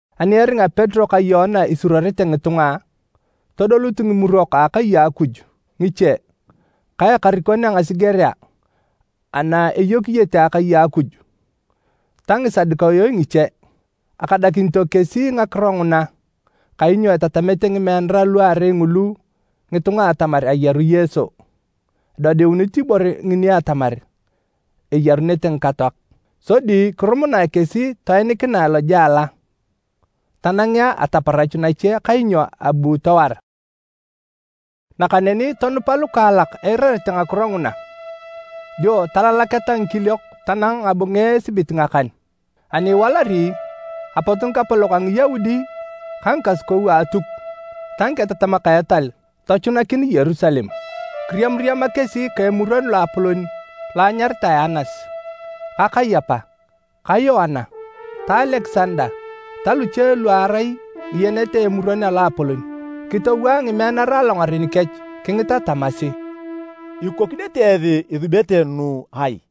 Ani eringa Petero ka Yoana isuruorete ngitunga, todolut Ngimurok a akai a Akuj ngiche ka ekarikon a ngasigerea ana eyokiyete akai a Akuj ta Ngisadukayo ngiche. Akadakinito kesi ngakiro nguna kainyo etatamete ngimeanara luarei ngulu ngitunga atamar ayaru Yesu, edodiunit ibore ngini atamar eyarunete ngikatoak. Sodi kirumunae kesi toenikinae lojela tanangea ataparach nache kainyo abu towar. Nakaneni tonupa lukaalak eirarete ngakiro nguna, dio talalaketa ngikiliok tanang ngabunge esibit ngakan. Ani iwalari, apot ngikapolok a Ngiyaudi ka ngikasukou a Atuk ta ngiketatamak a etal tochunakin Yerusalem. Kiriamariama kesi ka Emuron Loapolon lo anyaritae Anas, ka Kayapa, ka Yoana, ka Alekisanda ta luche lu arai ngiyenet a Emuron a Loapolon. Kitowaa ngimeanara alongaren kech kingita tamasi, “Ikokinete esi isubete nu ai?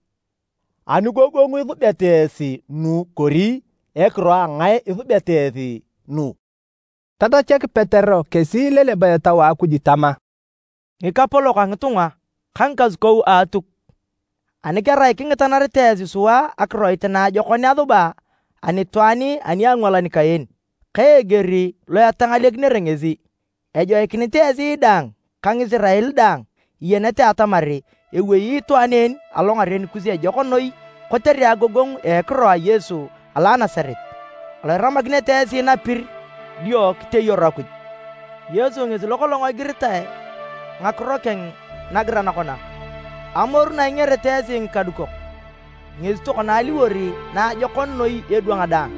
Anigogongu isubeta esi nu kori ekiro a ngae isubeta esi nu?” Tatachak Petero kesi ileleba Etau a Akuj tama, “Ngikapolok a ngitunga ka ngikasukou a Atuk, ani kerai kingitanarete esi sua akiroit naajokon asuba anitwaan ani a angwalan kaen, ka eger lo etangalekinere ngesi, ejoikinit esi daang ka Ngisirael daang iyenete atamar ewei itwaan en alongaren kus ejok noi kotere agogongu a ekiro a Yesu alo a Nasaret alo iramakinete esi napir dio kiteyaru Akuj. Yesu ngesi lokolong igiritae ngakiro keng nagiran kona, ‘Amoru na ingerete esi ngikadukok ngesi tokona aliwor naajokon noi edwang daang.’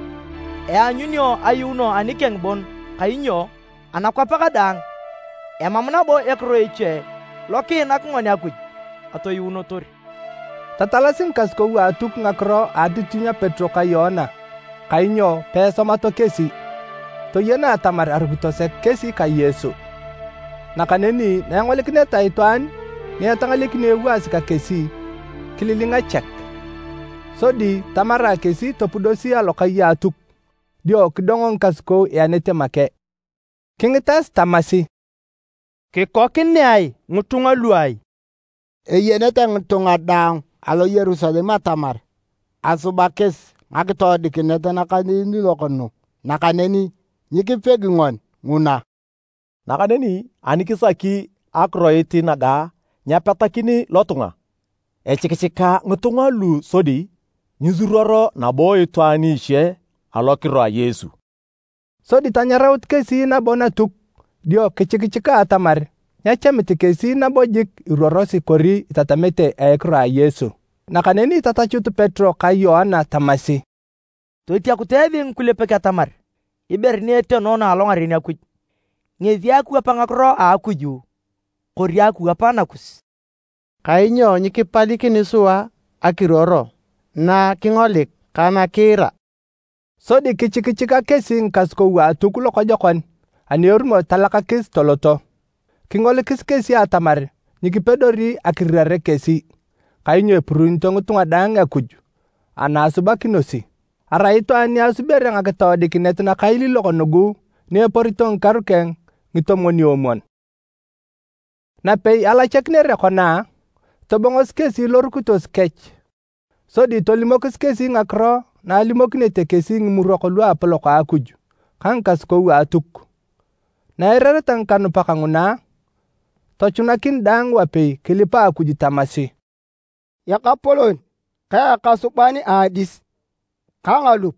Eanyunio ayuuno anikeng bon kainyo anakwap kadaang, emam nabo ekiro eche lo kiinak ngoni Akuj atoyuunotor.” Tatalasi ngikasukou a Atuk ngakiro a atitinyu a Petero ka Yoana kainyo peesomato kesi. Toyena atamar arukito sek kesi ka Yesu. Nakaneni na engolikineta itwaan ni etangalekinio ewaasi ka kesi, kililinga chek. Sodi tamarae kesi topudosi alokai a Atuk dio kidongo ngikasukou ianete make. Kingitas tamasi, “Kikokinea ngitunga lu ai? Eyenete ngitunga daang alo Yerusalem atamar asuba kesi ngakitoodikinet nakailiilok nugu nakaneni nyikipegi ngoni nguna. Nakaneni ani kisaki akiroit naga nyepetakin lotunga, echikichika ngitunga lu sodi nyiisuruor nabo itwaan iche alokiro a Yesu.” Sodi tanyaraut kesi nabo Natuk dio kichikichika atamar nyechamit kesi nabo jik iruorosi kori itatamete a ekiro a Yesu. Nakaneni tatachut Petero ka Yoana tamasi, “Totiakutu esi ngikulepek atamar ibore ni etenoono alongaren Akuj, ngesi akiwap ngakiro a Akuj kori akiwap nakus? Kainyo nyikipalikini sua akiruor na kingolik ka nakiira.” Sodi kichikichika kesi ngikasukou a Atuk lokojokon ani erumor talachakis toloto. Kingolikis kesi atamar nyikipedori akirirare kesi kainyo epuruunito ngitunga daang Akuj ana asubakinosi. Arai itwaan ni asubere ngakitoodikinet nakailiilok nugu ni eporito ngikaru keng ngitomwon-omwon. Napei alachakinere kona, tobongosi kesi lorukitos kech sodi tolimokis kesi ngakiro na alimokinete kesi Ngimurok Luapolok a Akuj ka ngikasukou a Atuk. Na eirareta ngikanupak nguna, tochunakin daang wapei kilipa Akuj tamasi, “Ekapolon ka ekasuban a adis ka ngalup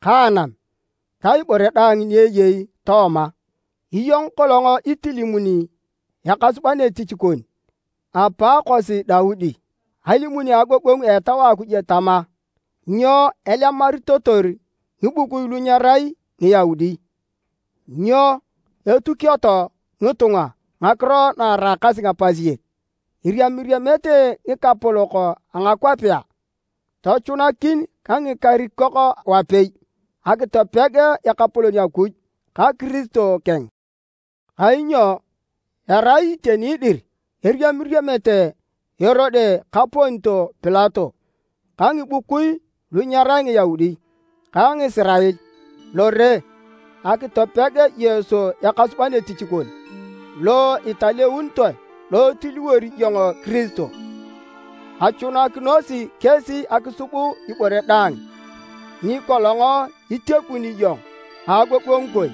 ka anam ta ibore daang ni eyei tooma! Iyong kolong itilimuni ekasuban etich kon, apaakosi Daudi alimun a agogongu a Etau a Akuj tama, ‘Nyo alemaritotor ngibukui lu nyerai Ngiyaudi? Nyo atukioto ngitunga ngakiro na eraakasi ngapasiek? Eriamiriamete ngikapolok a ngakwapea, tochunakin ka ngikarikok wapei, akitopeg Ekapolon Akuj ka Kiristo keng.’ Kainyo erai iteni dir eriamiriamete Erode ka Pontio Pilato ka ngibukui lu nyerai Ngiyaudi ka Ngisirael lore akitopeg Yesu, Ekasuban etich kon lo italeunitoe lo itiliwori iyong Kiristo. Achunakinosi kesi akisub ibore daang ni kolong itiakuni iyong a agogongu kon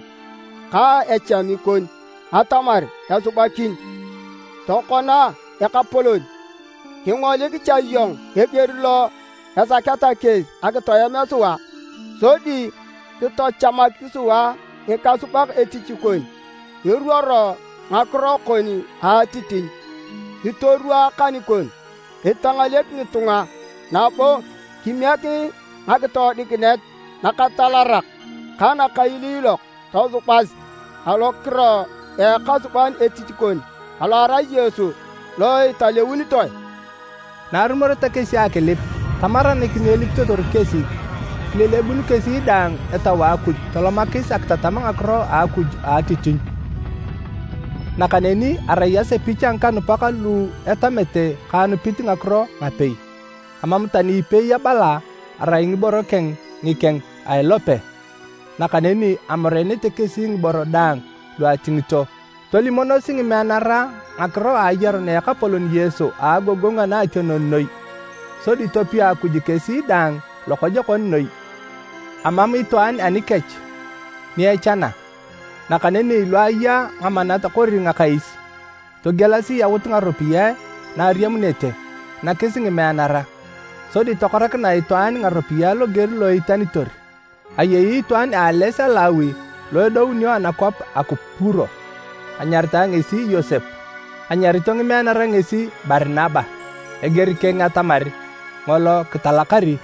ka echami kon atamar esubakin. Tokona Ekapolon, kingolik cha iyong eger lo esaketa kesi akitoem sua, sodi kitochamak sua ngikasubak etich kon eruoro ngakiro kon a atitinyu. Kitorwaa akan kon kitangalek ngitunga, nabo kimiek ngakitoodikinet nakatalarak ka nakailiilok tosubas alokiro a ekasuban etich kon alo erai Yesu lo italeunitoe.” Na arumoreta kesi akilip, tamaranik ni elipitotor kesi. Kilelebun kesi daang Etau a Akuj tolomakis akitatam ngakiro a Akuj a atitinyu. Nakaneni arai asepich a ngikanupak lu etamete ka anupit ngakiro ngapei. Amam tani ipei abala arai ngiboro keng ngikeng a ilope, nakaneni amoreenete kesi ngiboro daang lu atingito. Tolimonosi ngimeanara ngakiro a ayarun a Ekapolon Yesu a agogongu anaationon noi sodi topia Akuj kesi daang lokojokon noi. Emam itwaan anikech ni echana. Nakaneni lu aya ngamanat kori ngakais, togielasi yautu ngaropiyae na ariamunete, nakis ngimeanara, sodi tokoranakinae itwaan ngaropiyae loger lo eitanitor. Ayei itwaan a ales a Lawi lo edounio anakwap a Kupuro, anyaritae ngesi Yosep. Anyarito ngimeanara ngesi Barinaba (eger keng atamar “Ngolo kitalakari”),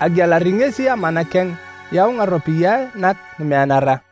agielari ngesi amana keng yau ngaropiyae nak ngimeanara.